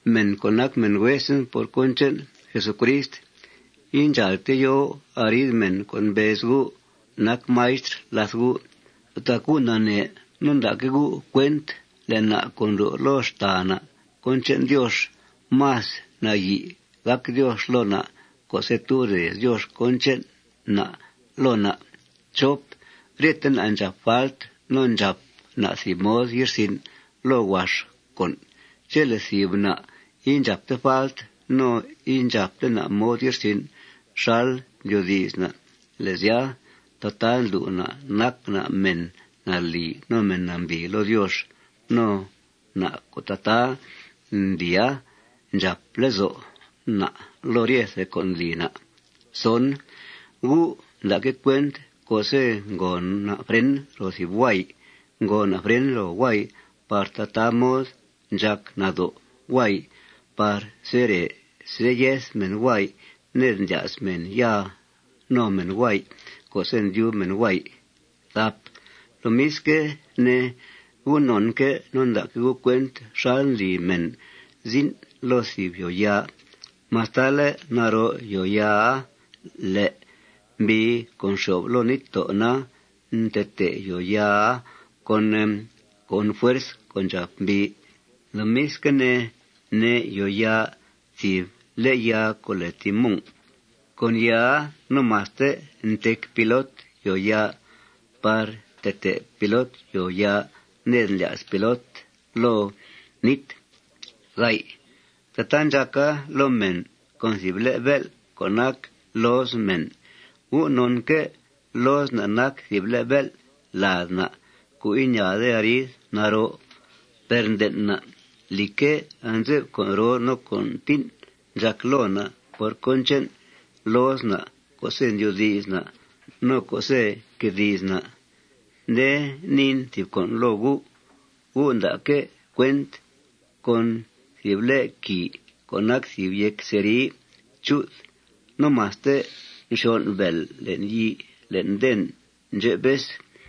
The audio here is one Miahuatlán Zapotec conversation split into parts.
Mèn co' nac mèn huesen por cón che'n Jesucrist, indxàalte yo arid mèn co' mbez gu' nac maistr làth gu'. Tac gu' nanee no nda'que' gu' cuent le' na' co' ndlu' loo xtàa na' cón che'n Diox, más nayi' gàc Diox loo na' co'se' tub rez Diox cón che'n na' loo na'. Ryete na' ndxàp falt no ndxàp na' thìb mod ye'rsin' loo huax con'. Chele' thìb na' indxàpte falt no indxàpte na' mod ye'rsin' xal ndyoodi's na', le' sya, tataa ndlu' na' nac na' mèn nalì no mèn nambìi loo Diox. No na' co' tataa ndlia, ndxàp lezo' na' loo ryethe con' ndli na'. Gu' nda'que' cuent co'se' ngòo na' fren ro thìb huay, ngòo na' fren ro huay par tataa mod ndxàc nado' huay par sere seyeth mèn huay ned ndlya's mèn ya no mèn huay co'se' ndyub mèn huay. Lomisque' ne, gu' nonque' no nda'que' gu' cuent xal ndli mèn zin' loo thìb yòoyaa. Mastale' naroo yòoyaaa, le' mbii co' nxyo'f loo níttó' na, ntetee yòoyaa con fuerz co' ndxàp mbii. Lomisque' ne, ne' yòoyaa thìb le' yaa co' lèe timón. Con yaaa no maste ntec pilot yòoyaa par ntetee pilot yòoyaa ned ndlya's pilot loo nít. Tataa ndxàca loo mèn con thìb le' bél' co' nac looz mèn. Gu' nonque' looz na' nac thìb le' bél' lad na' co' iñaade arid naroo. Per nden' na', lìcque', anze'f con' roo no con' tín' ndxàc loo na' por cón che'n looz na' co'se' ndyoodi's na' no co'se' nque di's na'. Nde niin thìb con' loo gu': Gu' nda'que' cuent con thìb le' quìi co' nac thìb yéc cerri chu'th no maste nxyon' bèel le'n yii le'n den ndxep vez.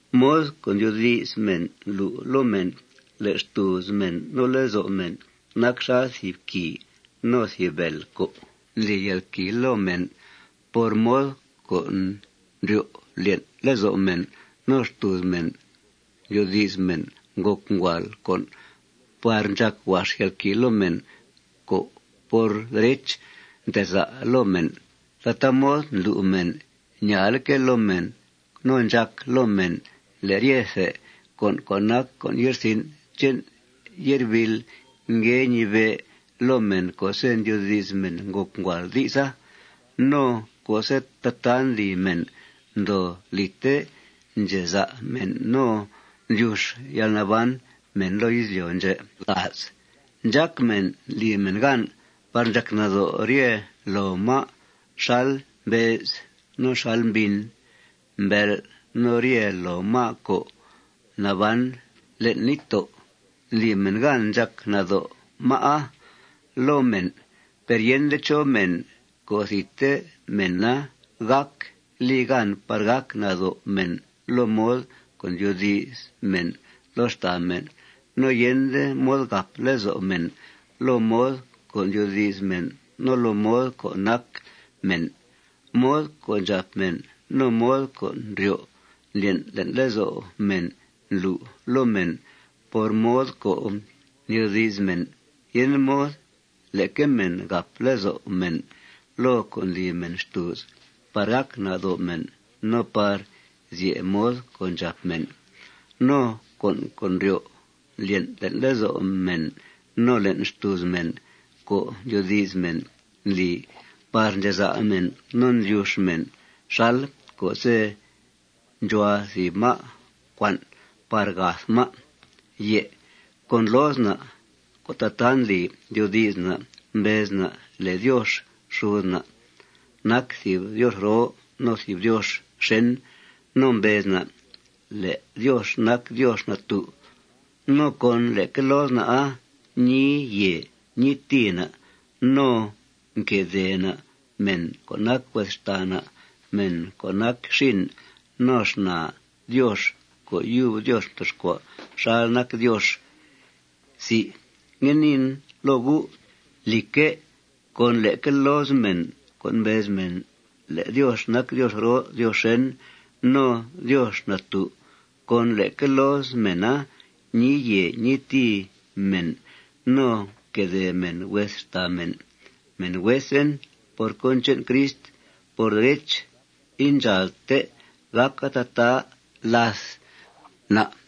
Mod co' ndyoodi's mèn ndlu' loo mèn le' xtùuz mèn no lezo' mèn nac xal thìb quìi no thìb bèel co' ndli yalquìi loo mèn. Por mod co' ndryo' ndlyen' lezo' mèn no xtùuz mèn ndyoodi's mèn ngòc nguàal con' par ndxàc huax yalquìi loo mèn co', por derech, nteza' loo mèn. Tataa mod ndlu' mèn ñaaleque' loo mèn no ndxàca loo mèn le' ryethe con' co' nac con' ye'rsin' che'n ye'rbiil ngue ñibe' loo mèn co'se' ndyoodi's mèn ngòc nguàal di'sa. No co'se' tataa ndli mèn, ndoo lìte ndxeza' mèn no ndlyux yalnaban mèn loo izlyo' ndxè'. Ndxác mèn ndli mèn gan par ndxàc nado' rye loo má' xal mbee's, no xal mbin, mbel', no rye loo má' co' naban le'n níttó'. Ndli mèn gan ndxàc nado' má'a loo mèn. Per yende chó mèn co' thidte mèna gác li gan par gàc nado' mèn loo mod co' ndyoodi's mèn loo xtàa mèn. No yende mod gàp lezo' mèn loo mod co' ndyoodi's mèn no loo mod co' nac mèn. Mod co' ndxàp mèn no mod co' ndryo' ndlyen' le'n lezo' mèn ndlu' loo mèn por mod co' ndyoodi's mèn yende mod leque mèn gàp lezo' mèn loo con' ndli mèn xtùuz par gàc nado' mèn no par zye' mod co' ndxàp mèn. No con' co' ndryo' ndlyen' le'n lezo' mèn no le'n xtùuz mèn co' ndyoodi's mèn ndli par ndxeza' mèn no ndlyux mèn xal co'se' ndxuhua thìb má' cuan' par gath má'. Con looz na' co' tataa ndli ndyoodi's na', mbez na' le' Diox xud na' nac thìb Diox roo no thìb Diox xèn. No mbez na' le' Diox nac Diox natú'. No con leque looz na'a ñii yèe ñii tìi na'. No nquedèe na' mèn co' nac hues xtàa na', mèn co' nac xin no xnaa Diox co' yub Diox mtoxcua' xal nac Diox. Ngue niin loo gu': Lìcque', con leque looz mèn co' mbez mèn le' Diox nac Diox roo Diox xèn no Diox natú', con leque looz mèna ñii yèe ñii tìi mèn no nquedèe mèn hues xtàa mèn. Mèn huesen por cón che'n Crist, por derech, indxàalte gàca tataa làth na'.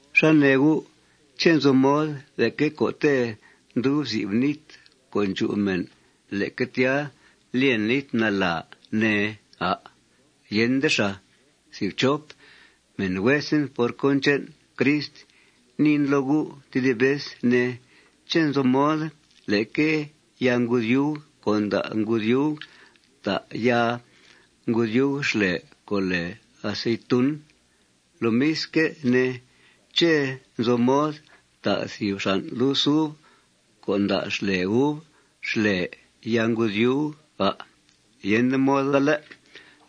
¿Xá nee gu'? ¿Ché' nzo mod leque co'te' ndub zib nít co' ndxu mèn, leque tya lyen nít nala, ne, à'? Yende xàa. Mèn huesen por cón che'n Crist, niin loo gu' tedib vez, ne: ¿Ché' nzo mod leque yaa ngudyuug co' nda' ngudyuug ta' yaa ngudyuug xlè co' lèe aceitun? Lomisque' ne, ¿ché' nzo mod ta' thìb xan' lus uv co' nda' xlè uv xlè yaa ngudyuug, à'? Yende moda, ¿lé'?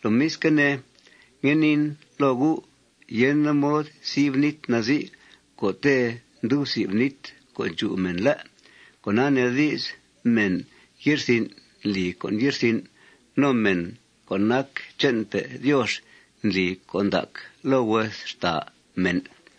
Lomisque' ne, ngue niin loo gu': Yende mod zib nít nazii co'te' ndub zib nít co' ndxu mèn, ¿lé'? Cona nee di's, mèn ye'rsin' ndli con' ye'rsin'. No mèn co' nac che'npe' Diox ndli con' ndac loo hues xtàa mèn.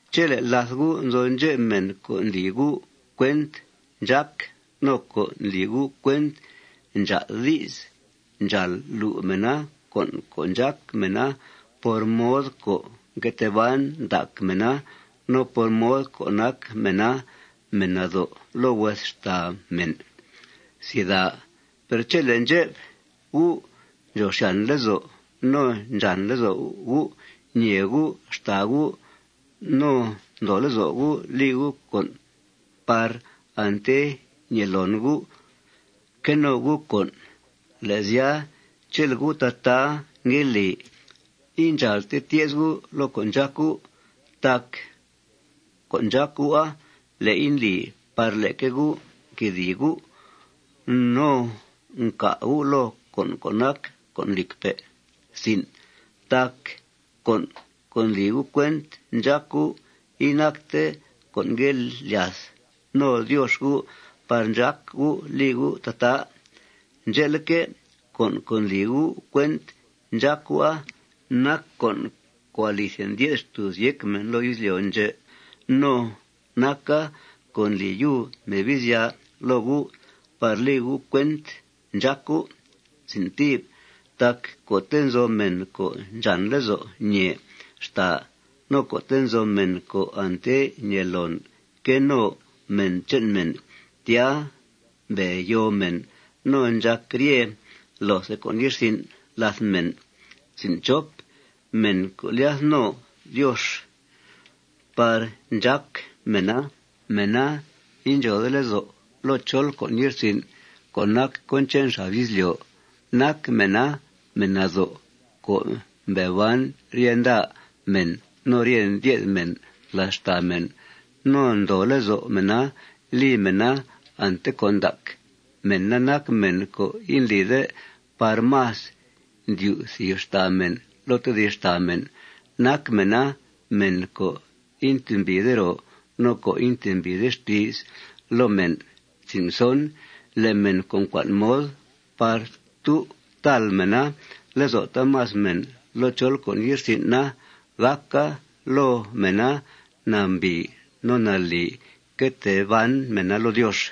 Chele' làth gu' nzo ndxep mèn co' ndli gu' cuent ndxác no co' ndli gu' cuent ndxaa'd di's, ndxàal lu' mèna con' co' ndxác mèna por mod co' nque tee ban ndac mèna no por mod co' nac mèna mèn nado' loo hues xtàa mèn. Per chele' ndxep gu' ndxòo xyàn lezo' no ndxàn lezo' gu' ñèe gu' xtàa gu' no ndoo lezo' gu' li gu' con' par ante ñèe loon gu' que no gu' con', le' sya, chele' gu' tataa ngue li, indxàalte tye's gu' loo con' ndxác gu'. Tac con' ndxác gu'a, le'i ndli par leque gu' nquedìi gu' no ncà gu' loo con' co' nac con' lìcpe'. Tac con' co' ndli gu' cuent ndxác gu', inacte con' ngue lyath no Diox gu' par ndxác gu' li gu' tataa. Ndxe'leque', con' co' ndli gu' cuent ndxác gu'a nac con' co' alithe ndye'th xtùuz yéc mèn loo izlyo' ndxè'. No naca con' ndli yub Mebizya loo gu' par li gu' cuent ndxác gu'. Tac co'te' nzo mèn co' ndxàn lezo' ñèe xtàa no co'te' nzo mèn co' ante ñèe loon que no mèn che'n mèn, tya mbe yoo mèn no ndxàc rye loothe con' ye'rsin' làth mèn. Men co' ndlyath no Diox par ndxác mèna, mèna indxòode lezo' loo chol con' ye'rsin' co' nac cón che'n xab izlyo'. Nac mèna mèn nado' co' mbe ban rye nda mèn no rye ndye'th mèn làth xtàa mèn. No ndoo lezo' mèna li mèna ante con' ndac. Mèna nac mèn co' indlide par más ndyu' thìb xtàa mèn loo tedib xtàa mèn. Nac mèna mèn co' intembìide ro no co' intembìide xti's loo mèn. Le' mèn co' ncua'n mod par tu' tàl mèna lezo' taamas mèn loo chol con' ye'rsin' na, gàca loo mèna nambìi no nalì que tee ban mèna loo Diox.